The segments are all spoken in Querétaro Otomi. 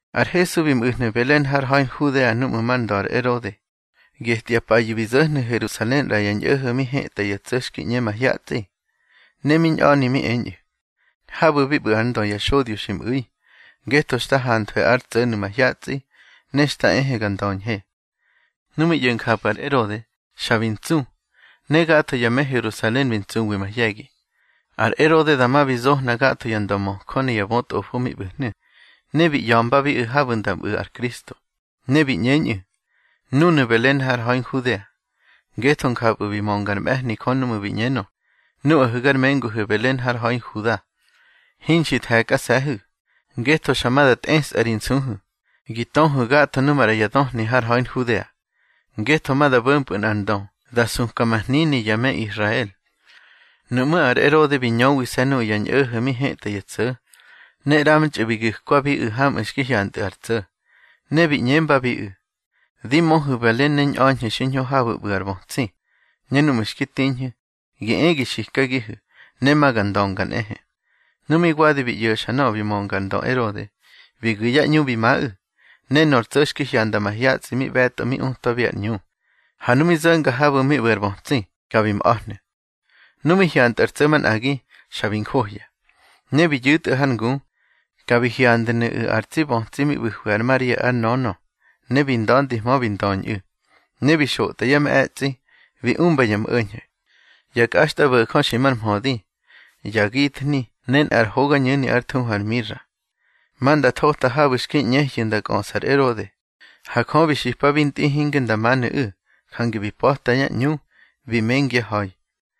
Ar Hesu bi mꞌu̱hnu̱ Belen har ha̱i Nhudea núꞌmu̱ mar ndö ar Erode. Getya payu̱ bi zo̱hnu̱ Herusalen ꞌra ya ñꞌo̱ho̱ mi hetꞌa ya tso̱ xki ꞌñe mahyatsꞌi. Ne mi ñꞌa̱ni mi eñꞌu̱: —Habu̱ bi ꞌbu̱ ár ndö ya xodyo xi mꞌu̱i, ngetho xta hanthwe ár tsꞌo̱nu̱ mahyatsꞌi, ne xta ehe ga ndöñhe. Nu mi ꞌyo̱ njapꞌu̱ ar Erode, xa bi ntsu, ne gatho ya me Herusalen bi ntsuwi mahye̱gi. Ar Erode dama bi zohna gatho ya ndömöjö ne ya bötꞌofo mi ꞌbu̱hnu̱, ne bi ꞌya̱mbabiꞌu̱ habu̱ nda mꞌu̱ ar Kristo. Ne bi ꞌñeñꞌu̱: —Núnu̱ Belen har ha̱i Nhudea, ngetho njapꞌu̱ bi mönga ár mꞌe̱hni Jö núꞌmu̱ bi ꞌñenö: Nuꞌahu̱ gar menguhu̱ Belen har ha̱i Huda, hinxi the̱kꞌase̱hu̱, ngetho xa ma da tꞌesꞌa ri nsuhu̱ gi töhu̱ gatho nu maꞌra ya döhni har ha̱i Nhudea; ngetho ma da bo̱mpꞌu̱ nꞌar ndö da suka ma hnini ya me Israel. Nuꞌmú̱ ar Erode bi ñöwise̱ nuꞌu̱ ya ñꞌo̱ho̱ mi hetꞌa ya tso̱, ne ꞌramtxꞌu̱ bi gu̱kwabiꞌu̱ hamꞌu̱ xki hyantꞌu̱ ar tso̱. Ne bi ꞌñembabiꞌu̱: —Di möhu̱ Belen ne ñꞌa̱ñhu̱ xiñho habu̱ ꞌbu̱ ar bötsi, ne núꞌmu̱ xki tiñhu̱, gi e gi xikagihu̱, ne ma ga ndönga nꞌehe. Nu mi wadi bi ꞌyo̱xa nöꞌö bi mönga ar ndö Erode, bi gu̱ yá ꞌñu bi maꞌu̱, ne nor tso̱ xki hyanda mahyatsꞌi mi ꞌbe̱tꞌo mi utwabiꞌu̱ ar ꞌñu. Ha nu mi zo̱nga habu̱ mi ꞌbu̱ ar bötsi, ka bi mꞌa̱hnu̱. Nu mi hyantꞌu̱ ar tso̱ manꞌagi, xa bi njohya. Ne bi yu̱tꞌu̱ har ngu, ka bi hyandnu̱ꞌu̱ ar tsi bötsi mi ꞌbu̱hwi ar Maria ár nönö, ne bi nda̱ndihmö bi ndöñꞌu̱. Ne bi xotꞌa yá mꞌe̱tsꞌi, bi umba ya mꞌo̱ñho̱: ya kꞌaxtꞌabo̱jö xi mar mhödi, ya githni ne nꞌar hogañu̱ni ár thuhu ar mira. Ma nda thota habu̱ xki ꞌñehyu̱ nda kꞌöꞌsa ar Erode. Ha Jö bi xipabi ntꞌi hinge nda manu̱ꞌu̱, jange bi pa̱ta yá ꞌñu, bi mengyá ha̱i.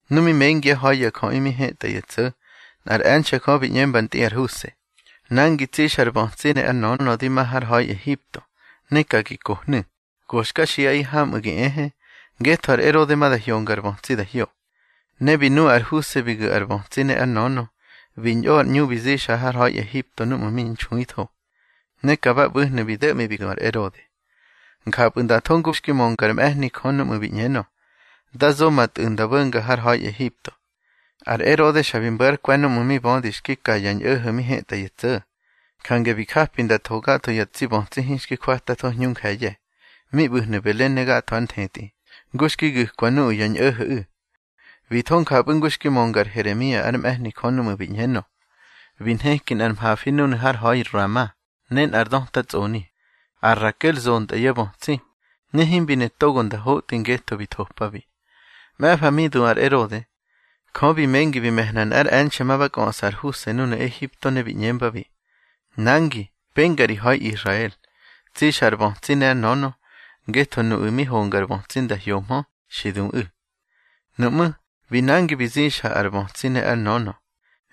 Nu mi mengyá ha̱i ya jöꞌi mi hetꞌa ya tso̱, nꞌár e̱nxe̱ Jö bi ꞌñemba ntꞌi ar Huse: —Nangi, tsixa ar bötsi ne ár nönö di ma har ha̱i Ehipto. Ne ka gi kohnu̱, go xka xiꞌaꞌi hamꞌu̱ gi ehe, ngetho ar Erode ma da hyonga ar bötsi da hyo. Ne bi nu ar Huse bi gu̱ ar bötsi ne ár nönö, bi ñꞌo ar ꞌñu bi zixa har ha̱i Ehipto núꞌmu̱ mi nxuitho. Ne ka ba ꞌbu̱hnu̱ bi do̱ꞌmi bi du ar Erode. Njapꞌu̱ nda tho ngu xki mönga ár mꞌe̱hni Jö núꞌmu̱ bi ꞌñenö: Da zo ma Tꞌu̱ nda bo̱nga har ha̱i Ehipto. Ar Erode xa bi mbo̱ ár kwe̱ núꞌmu̱ mi bödi xki ka ya ñꞌo̱ho̱ mi hetꞌa ya tso̱. Jange bi japi nda tho gatho ya tsi bötsi hinxki jwatꞌatho hñu nje̱ye̱, mi ꞌbu̱hnu̱ Belen ne gatho ár nthetꞌi, ngu xki gu̱kwa nuꞌu̱ ya ñꞌo̱ho̱ꞌu̱. Bi tho njapꞌu̱ ngu xki mönga ar Heremia ár mꞌe̱hni Jö núꞌmu̱ bi ꞌñenö: Bi nheki nꞌar mhafi núnu̱ har ha̱i Rama ne nꞌar döta tsꞌoni; ar Rakel zontꞌa yá bötsi, ne himbi ne togo nda hotꞌi ngetho bi thopabi. Mꞌe̱fa mi du ar Erode, Jö bi mengi bi me̱hna nꞌár e̱nxe̱ ma ba kꞌöꞌsa ar Huse núnu̱ Ehipto, ne bi ꞌñembabi: —Nangi, penga ri ha̱i Israel, tsixa ar bötsi ne ár nönö, ngetho nuꞌu̱ mi honga ar bötsi nda hyohmö, xi duꞌu̱. Nuꞌmú̱, bi nangi bi zixa ar bötsi ne ár nönö,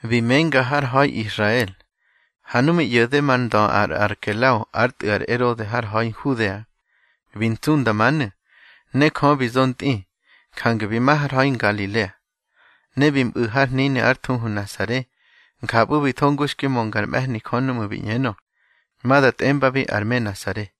bi menga har ha̱i Israel. Ha nu mi ꞌyo̱de mar ndö ar Arkelao ár tꞌu̱ ar Erode har ha̱i Nhudea, bi ntsu nda manu̱. Ne Jö bi zo ntꞌi, jange bi ma har ha̱i Ngalilea. Ne bi mꞌu̱ har hnini ár thuhu Nasare. Njapꞌu̱ bi tho ngu xki mönga ár mꞌe̱hni Jö núꞌmu̱ bi ꞌñenö: Ma da tꞌembabi ar me Nasare.